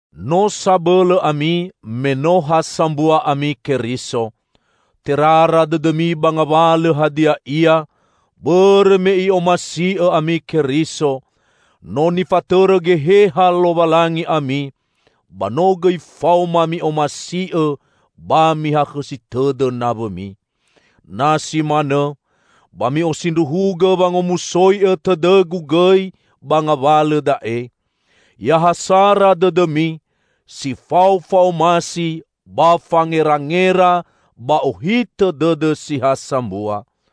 No sabõlõ ami, me no ha sambua ami Keriso. Terara dõdõmi ba ngawalõ hadia ia, bõrõ me I'omasi'õ ami Keriso! No nifatõrõ Geheha Lowalangi ami, ba no gõi faoma mi'omasi'õ ba mihakhõsi tõdõ nawõmi. Na si manõ, ba mi'osindruhugõ wangomusoi'õ tõdõgu gõi ba ngawalõ da'e: Ya ha sara dõdõmi, si fao fa'omasi ba fangerangera ba ohitõ dõdõ si ha sambua.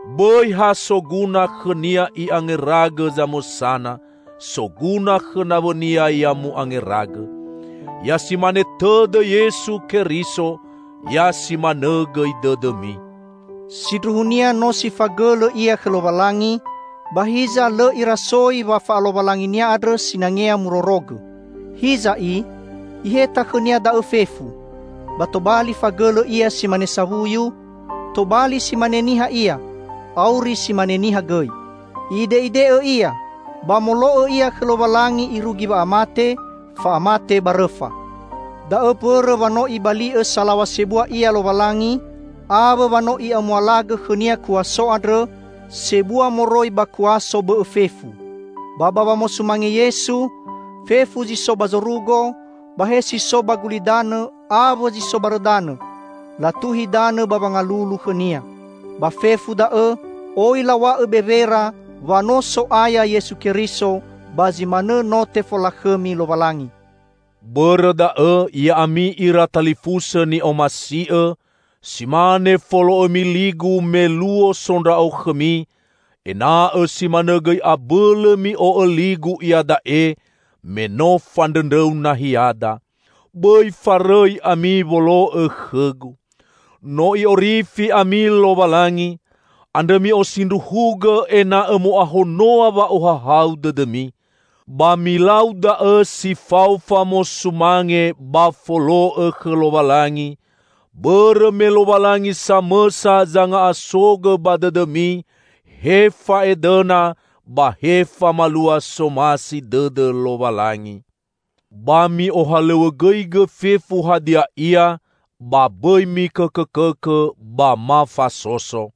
Bõi ha soguna khõnia i'angeragõ zamõsana, soguna khõ nawõnia ya mu'angeragõ. Ya simane tõdõ Yesu Keriso, ya simanõ gõi dõdõmi: Sindruhunia no si fagõlõ Ia khõ Lowalangi, ba hiza, lõ Irasoi wa fa'alowalangi-Nia andrõ sinangea murorogõ. Hiza i, Iheta khõ-Nia da'õ fefu, ba tobali fagõlõ Ia si mane sawuyu, tobali si mane niha Ia, auri si mane niha gõi. I'ide'ide'õ Ia, ba molo'õ Ia khõ Lowalangi irugi wa'amate -- fa'amate ba rõfa. Da'õ mbõrõ wa no Ibali'õ salaw̃a sebua Ia Lowalangi, awõ wa no I'amualagõ khõ-Nia kuaso andrõ sebua moroi ba kuaso bõ'õ fefu. Ba ba wamosumange Yesu, fefu zi so ba zorugo, ba he si so ba gulidanõ awõ zi so barõ danõ, latuhi danõ ba wangalulu khõ-Nia. Ba fefu da'õ oi law̃a'õ bewera wa no So'aya Yesu Keriso; ba zi manõ no tefolakhõmi Lowalangi. Bõrõ da'õ, ya'ami ira talifusõ ni'omasi'õ, si mane folo'õmi ligu me luo so ndra'o khõmi, ena'õ si manõ gõi abõlõ mi'o'õ ligu iada'e me no fandrõndrõu nahiada. Bõi farõi ami wolo'õ khõgu. No I'orifi ami Lowalangi, andrõ mi'osindruhugõ ena'õ mo'ahonoa wa'ohahau dõdõmi. Ba milau da'õ si fao famosumange ba folo'õ khõ Lowalangi, bõrõ me Lowalangi samõsa zanga'asogõ ba dõdõmi he fa'edõna ba he famalua somasi dõdõ Lowalangi. Ba mi'ohalõw̃õgõigõ fefu hadia ia, ba bõi mikõkõkõkõ ba ma fasoso.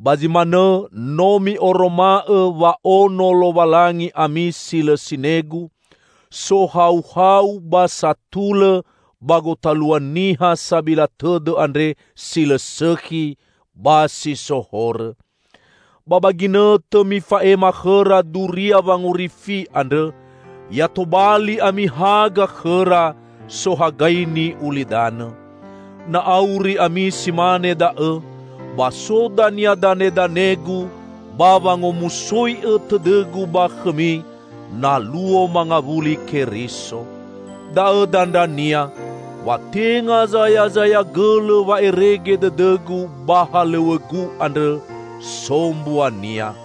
Ba zi manõ no mi'oroma'õ wa ono Lowalangi ami si lõ sinegu, sohauhau ba satulõ ba gotalua niha sabila tõdõ andre si lõ sõkhi ba si so horõ. Ba ba ginõtõ mifa'ema khõra duria wangorifi andrõ, ya tobali ami haga khõra, sohagaini ulidanõ. Na auri ami si mane da'õ, ba so dania danedanegu ba wangomusoi'õ tõdõgu ba khõmi, na luo mangawuli Keriso. Da'õ dandrania, wa tenga zayazaya gõlõ wa'erege dõdõgu ba halõw̃õgu andrõ, so mbuania.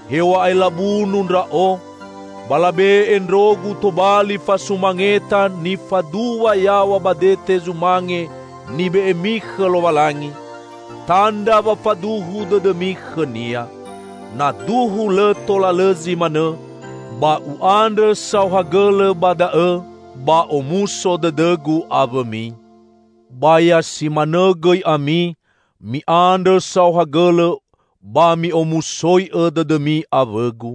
Hew̃a'ae labunu ndra'o, ba labe'e ndrogu tobali fasumangeta nifaduwa yaw̃a ba dete zumange nibe'emi khõ Lowalangi, tandra wa faduhu dõdõmi khõ-Nia. Na duhu lõ tola lõ zi manõ, ba u'andrõ saohagõlõ ba da'õ ba omuso dõdõgu awõmi. Ba ya simanõ gõi ami, mi'andrõ saohagõlõ ba mi'omusoi'õ dõdõmi awõgu.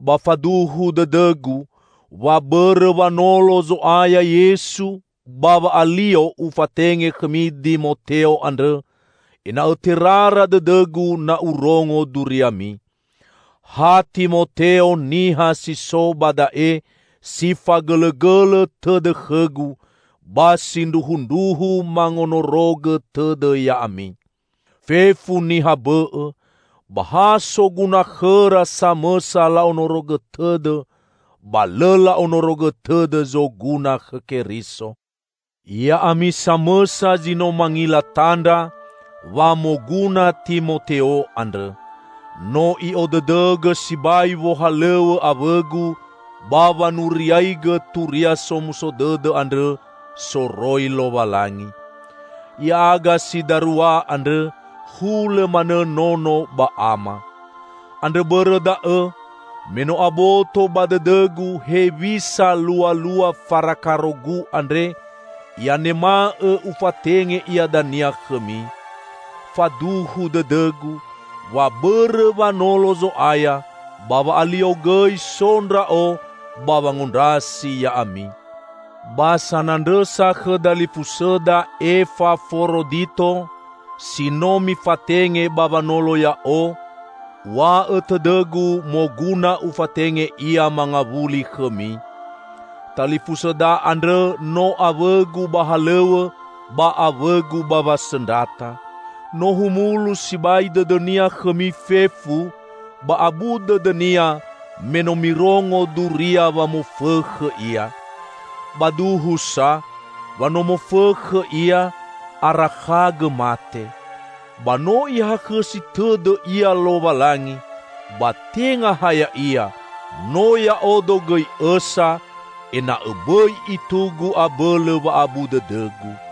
Ba faduhu dõdõgu, wa bõrõ wanolo Zo'aya Yesu, ba wa'alio ufatenge khõmi Dimoteo andrõ, ena'õ terara dõdõgu na urongo duriami. Ha Timoteo niha si so ba da'e si fagõlõgõlõ tõdõ khõgu, ba sindruhundruhu mangonorogõ tõdõ ya'ami. Fefu niha bõ'õ, ba ha soguna khõra samõsa la'onorogõ tõdõ, ba lõ la'onorogõ tõdõ zoguna khõ Keriso. Ya'ami samõsa zi no mangila tandra, wa moguna Timoteo andrõ. No i'odõdõgõ sibai wohalõw̃õ awõgu ba wanuriaigõ Turia Somuso Dõdõ andrõ soroi Lowalangi. Ya'aga si darua andrõ hulõ manõ nono ba ama. Andrõ bõrõ da'õ, me no aboto ba dõdõgu hewisa lualua farakarogu andre, i'anema'õ ufatenge ia dania khõmi. Faduhu dõdõgu, wa bõrõ wanolo Zo'aya, ba wa'alio gõi so ndra'o ba wangondrasi ya'ami. Ba sanandrõsa khõ dalifusõda Efaforodito, si no mifatenge ba wanolo ya'o, uw̃a'õ tõdõgu moguna ufatenge ia mangawuli khõmi. Talifusõda andrõ no awõgu ba halõw̃õ ba awõgu ba wasõndrata. No humulu sibai dõdõnia khõmi fefu, ba abu dõdõnia me no mirongo duria wa mofõkhõ ia. Ba duhu sa, wa no mofõkhõ ia, arakhagõ mate. Ba no Ihakhõsi tõdõ ia Lowalangi; ba tenga ha ya'ia, no ya'odo gõi õsa, ena'õ bõi itugu abõlõ wa'abu dõdõgu.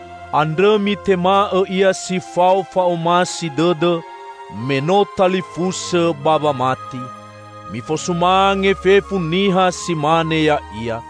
Andrõ mitema'õ ia si fao fa'omasi dõdõ, me no talifusõ ba wamati. Mifosumange fefu niha si mane ya'ia.